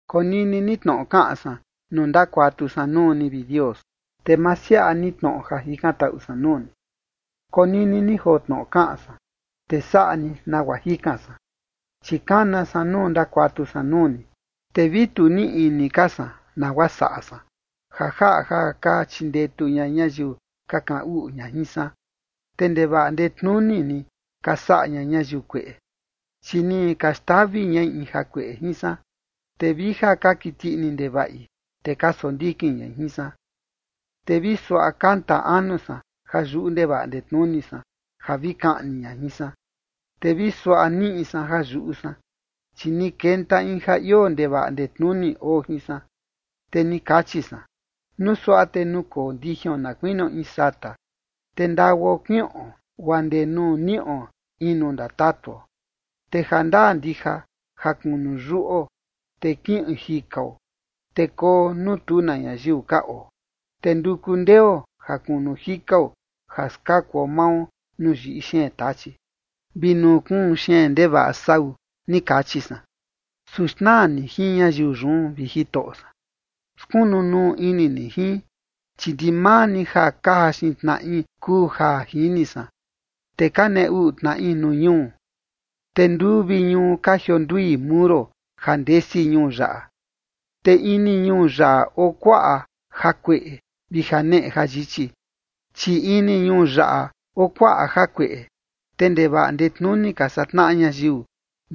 Konini ni tnoꞌo kaꞌan san nuu ndakuatu san nuu ni, vi Dios, te ma siaꞌa ni tnoꞌo ja jikantaꞌu san nuu ni. Konini ni joo tnoꞌo kaꞌan san, te saꞌa ni nagua jikan san, chi kana san nuu ndakuatu san nuu ni. Te vi tu niꞌi ini ka san nagua saꞌa san, ja jaꞌa ja ka chindetu ña ñayiu ka kaꞌan uꞌu ña jin san. Te ndevaꞌa ndetnuni ni ka saꞌa ña ñayiu kueꞌe, chi ni ka xtavi ñai in jakueꞌe jin san, te vi ja ka kiti ini ndevaꞌi, te ka sondikin ñai jin san. Te vi suaꞌa kanta anu san ja yuꞌu ndevaꞌa ndetnuni san ja vi kaꞌni ña jin san. Te vi suaꞌa niꞌi san ja yuꞌu san, chi ni kenta in ja ioo ndevaꞌa ndetnuni oo jin san. Te ni kachi san: “Nuu suaꞌa te nukoo ndijion na kuinio in sata, te ndaguao kiꞌon guaa ndee nuu niꞌo in nuu ndatatuo. Te jandaa ndija ja kunu yuꞌo, te kiꞌin jikao, te koo nuu tu na ñayiu ka oo. Te nduku ndeo ja kunu jikao ja skakuo mao nuu yiꞌi xeen tachi vi nuu kuun xeen ndevaꞌa sau”, ni kachi san. Su xnaa ni jin ñayiu yun, vi Jitoꞌo san. Skunu nuu ini ni jin, chi ndimaa ni ja ka jaxin tnaꞌi kuu ja jini san, te ka nee uꞌu tnaꞌi nuu ñuu. Te nduu vi ñuu ka jiondui muro ja ndesi ñuu yaꞌa, te ini ñuu yaꞌa oo kuaꞌa jakueꞌe vi janeꞌe jayichi. Chi ini ñuu yaꞌa oo kuaꞌa jakueꞌe, te ndevaꞌa ndetnuni ka saꞌa tnaꞌa ñayiu,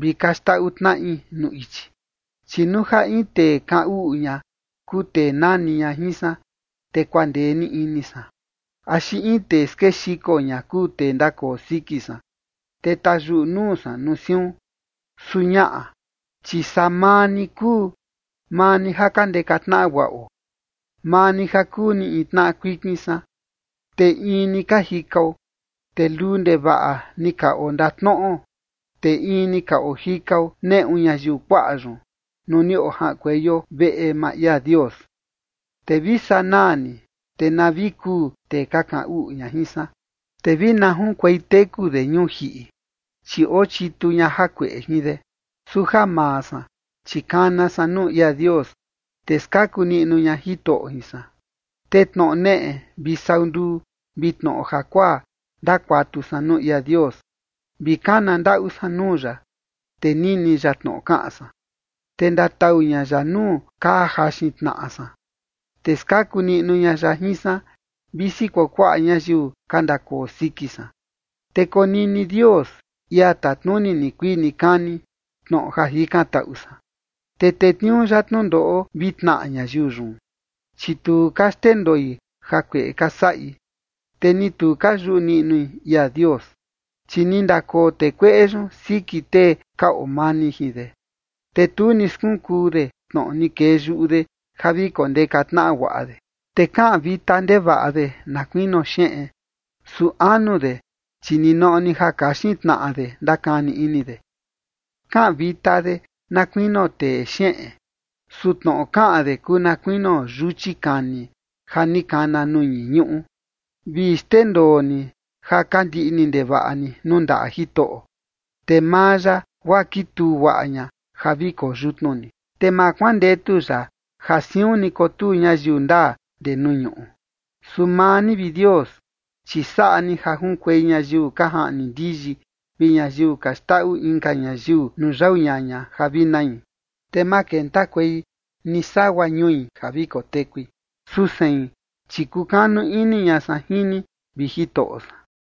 vi ka xndaꞌu tnaꞌi nuu ichi. Chi nuu ja in tee kaꞌan uꞌu ña kuu tee nani ña jin san, te kuandee ni ini san, axi in tee skexiko ña kuu tee ndakoo siki san, te tayuꞌu nuu san nuu siun. Su ñaꞌa, chi saa maa ni kuu, maa ni ja ka ndeka tnaꞌa guaꞌo, maa ni ja kuu ni in tnaꞌa kuikin san, te in ni ka jikao. Te luu ndevaꞌa ni ka ondatnoꞌo, te in ni ka ojikao neꞌu ñayiu kuaꞌa yun, nuu ni ojaꞌankueio veꞌe maa ia Dios. Te vi sanaa ni, te na vi kuu tee ka kaꞌan uꞌu ña jin san, te vi na junkuei teku de ñuu jiꞌi, chi oo chitu ña jakueꞌe jin de. Su ja maa san, chi kana san nuu ia Dios, te skaku niꞌnu ña Jitoꞌo jin san. Te tnoꞌo neꞌe vi sau nduu vi tnoꞌo jakuaa ndakuatu san nuu ia Dios, vi kana ndaꞌu san nuu ya, te nini ya tnoꞌo kaꞌan san. Te ndatau ña ya nuu ka jaxin tnaꞌa san, te skaku niꞌnu ña ya jin san, visi kuakuaꞌa ñayiu ka ndakoo siki san. Te konini Dios, ia tatnuni nikuii nikani, tnoꞌo ja jikantaꞌu san, te tetniuu ya tnundoꞌo vi tnaꞌa ñayiu yun, chi tu ka xndendoi jakueꞌe ka saꞌi, te ni tu ka yuꞌu niꞌnui ia Dios. Chi ni ndakoo tee kueꞌe yun siki tee ka oo mani jin de, te tu ni skunkuu de tnoꞌo ni kee yuꞌu de ja vi kondeka tnaꞌa guaꞌa de. Te kaꞌan vita ndevaꞌa de na kuinio xeꞌen, su anu de, chi ninoꞌo ni ja kaxin tnaꞌa de ndakani ini de. Kaꞌan vita de na kuinio tee xeꞌen, su tnoꞌo kaꞌan de kuu na kuinio yuchi kani ja ni kana nuu ñii ñuꞌu. Vi xndendoo ni ja ka ndiꞌni ndevaꞌa ni nuu ndaꞌa Jitoꞌo, te maa ya, guaa kituu guaꞌa ña ja vi koo yutnu ni, te ma kuandetu ya ja siun ni kotuu ñayiu ndaa ndee nuu ñuꞌu. Su maa ni, vi Dios, chi saꞌa ni ja junkuei ñayiu ka jaꞌni ndiyi vi ñayiu ka xndaꞌu inka ñayiu nuu yau ñaña ja vi nai, te ma kentakuei ni sagua ñui ja vi kotekui. Su sein, chi kukanu ini ña san jin ni, vi Jitoꞌo san.